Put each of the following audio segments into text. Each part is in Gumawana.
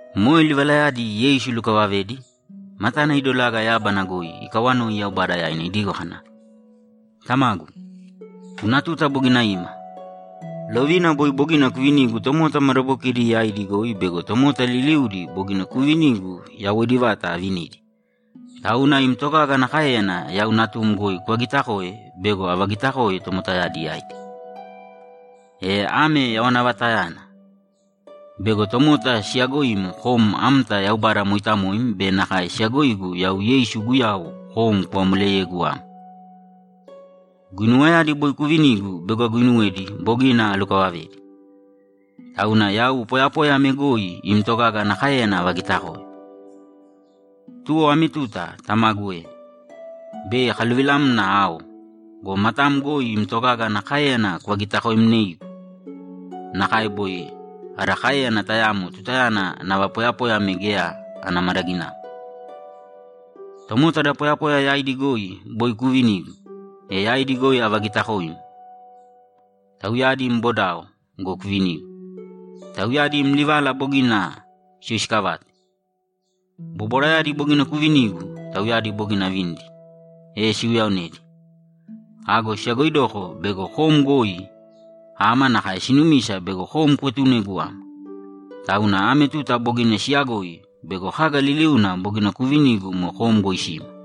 Moe livalayadi Yeisu ilukavavedi, matana idolaga yábana goi ikawanoi Yaubada yaina idigo kana, ‘Tamagu, guna tuta bogina ima. Lovina boi bogina kuvinigu tomota madabokidi yaidi goi bego tomota liliudi bogina kuuvinigu yawoidi vata avinidi. Tauna im togaga ana káeyana yau Natum goi kuvagitakōe bego avagitakoe tomotayadi yaidi. E ame yawana vatayana: Bego tomota siyaagoim kom amta Yaubada mooitamoim be nakae siyagoigu yau Yeisu Guyau kom kuvamoleyegu ama. Guinuwayadi boi kuuvinigu bego aguuinuwedi bogina alukavavedi. Tauna yau poyapoya ame goi im togaga ana káeyana avagitakoe. Tuwo ame tuta, Tamagu e, bei akaluvilamna ao go, matam goi im togaga ana káeyana kuvagitakomnēigu nakae boi ada káeyana tayamo tutayana nava poyapoya ame geya ana madaginamo. Tomota da poyapoya yaidi goi boi kuuvinigu, e yaidi goi avagitakoim. Tauyadi im bodao go, kuvinigu. Tauyadi im livala bogina siyoisikavate. Bobwarayadi bogina kuuvinigu, tauyadi bogina avinidi, e siuyaonedi. Ago siyagoidoko bego kom goi ama nakae sinumisa bego kom kuetunegu ama. Tauna ame tuta bogina siyagoi bego kaga liliuna bogina kuuvinigu moe kom goi sima.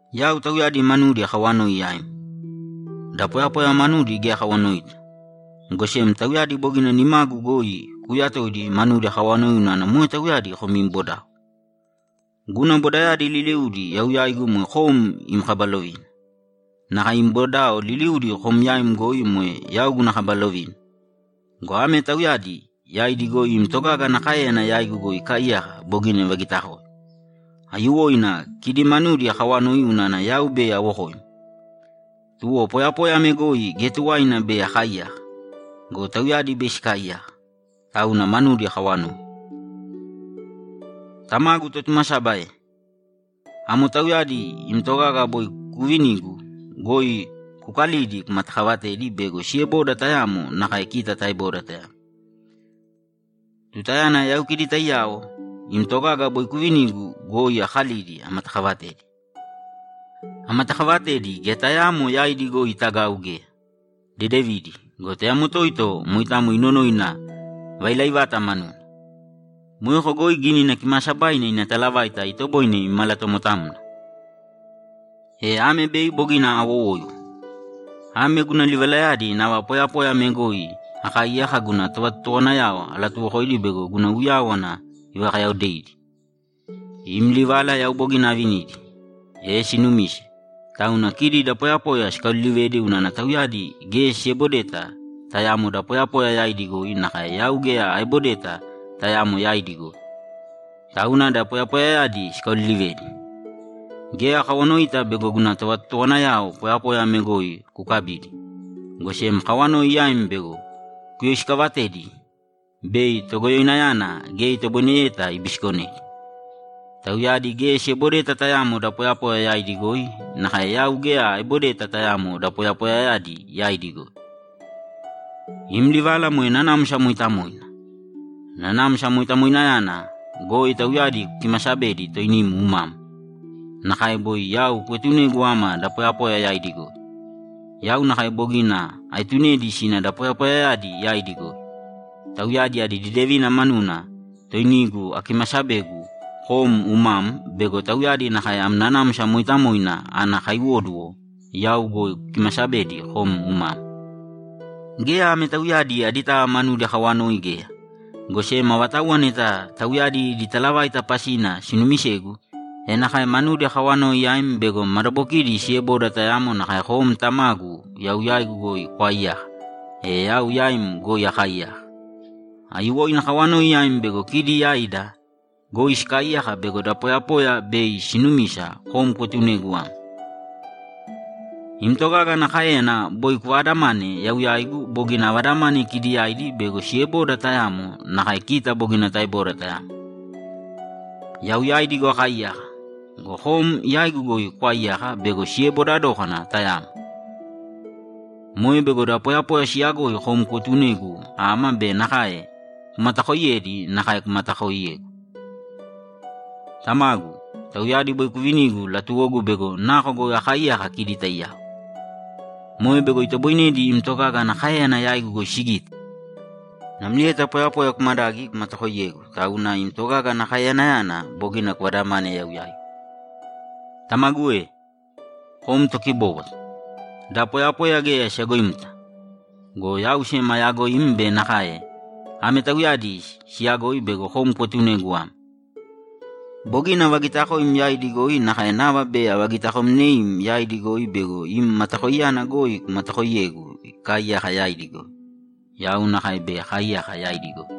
Yau tauyadi manudi akawanoi yaim. Da poyapoya manudi geya akawanoita, go sem tauyadi bogina nimagu goi kuuyatoidi manudi akawanoi unana moe tauyadi kom im bodao. Guna bodayadi liliudi yau yaigu moe kom im kaba lovina. Nakae im bodao liliudi kom yaim goi moe yau guna kaba lovina go, ame tauyadi yaidi goi im togaga ana káeyana yaigu goi ikaaiyaka bogina sivagitakoe. Aiyuwoina kidi manudi akaawanoi unana yau bei awokoim, tuwo poyapoya ame goi geya tuwaina bei akaaiyaka go, tauyadi bei sikaaiyaka. Tauna manudi akaawanoi. Tamagu Totumasaba e, amo tauyadi im togaga boi kuuvinigu goi kukalīdi kumatakavatēdi bego sieboda tayamo nakae kita taeboda tayamo. Tutayana yau kidi taiyao, im togaga boi kuuvinigu goi akalidi amatakavatedi. Amatakavatedi, geya tayaamo yaidi goi itagau geya, dedevidi go, tayamo toito moitamo inonoina vailaivata manuna. Moeko goi Gínina Kimaasabaina ina talavaita itoboine imalatomotamna. E ame bei bogina awowoiwo. Ame guna livalayadi nava poyapoya ame goi akaaiyaka guna tovatotowanayao alatuwokoidi bego guna uyáwana ivakayaodeidi. Im livala yau bogina avinidi, e sinumise, tauna kidi da poyapoya sikaolilivedi unana tauyadi geya siebodeta tayamo da poyapoya yaidi goi nakae yau geya aebodeta tayamo yaidi goi. Tauna da poyapoyayadi sikaolilivedi. Geya akawanoita bego guna tovatotowanayao poyapoya ame goi kukabidi, go sem akawanoi yaim bego kuyoisikavatedi bei Togoyoinayana geya itoboineyeta ibisikonedi. Tauyadi geya siebodeta tayamo da poyapoya yaidi goi nakae yau geya aebodeta tayamo da poyapoyayadi yaidi goi. Im livala moe Nanamsa Mooitamoina. Nanamsa Moitamoinayana goi tauyadi kukimasabēdi toinim umam. Nakae boi yau kuetunegu ama da poyapoya yaidi goi, yau nakae bogina aetunedi sina da poyapoyayadi yaidi goi. Tauyadi adi dedevina manuna toinigu akimasabegu kom umam bego tauyadi nakae am Nanamsa Mooitamoina ana kaiwóduwo yau goi kukimasabedi kom umam. Geya ame tauyadi aditava manudi akaawanoi geya, go sem avatauwa neta tauyadi idi talavaita pasina sinuumisegu, e nakae manudi akaawanoi yaim bego madabokidi sieboda tayamo nakae kom, Tamagu, yau yaigu goi kwaaiyaka, e yau yaim goi akaaiyaka. Aiyuwoina akawanoi yaim bego kidi yaida goi sikaaiyaka bego da poyapoya bei sinumisa kom kuetunegu ama. Im togaga ana káeyana boi kuvaadamane yau yaigu bogina avadamane kidi yaidi bego sieboda tayamo nakae kita bogina taeboda tayamo. Yau yaidi goi akaaiyaka go, kom yaigu goi kwaaiyaka bego sieboda dókana tayamo. Moe bego da poyapoya siyagoi kom kuetunegu ama be nakae kumatakoiyedi nakae kumatakoiyegu. Tamagu, tauyadi boi kuuvinigu latuwogu bego nako goi akaaiyaka kidi taiyao. Moe bego itoboinedi im togaga ana káeyana yaigu goi sigite. Namlieta poyapoya kumadagi, kumatakoiyegu, tauna im togaga ana kaeyanayana boi kuvadamane yau yaigu. Tamagu e, kom tokibóbwata. Da poyapoya geya siyagoimta. Go yau sem ayaagoim be nakae ame tauyadi siiyagoi bego kom kuetunegu ama. Bogina avagitakoim yaidi goi nakae nava bei avagitakomneim yaidi goi bego im matakoiyana goi kumatakooiyegu ikaaiyaka yaidi goi. Yau nakae bei akaaiyaka yaidi goi.’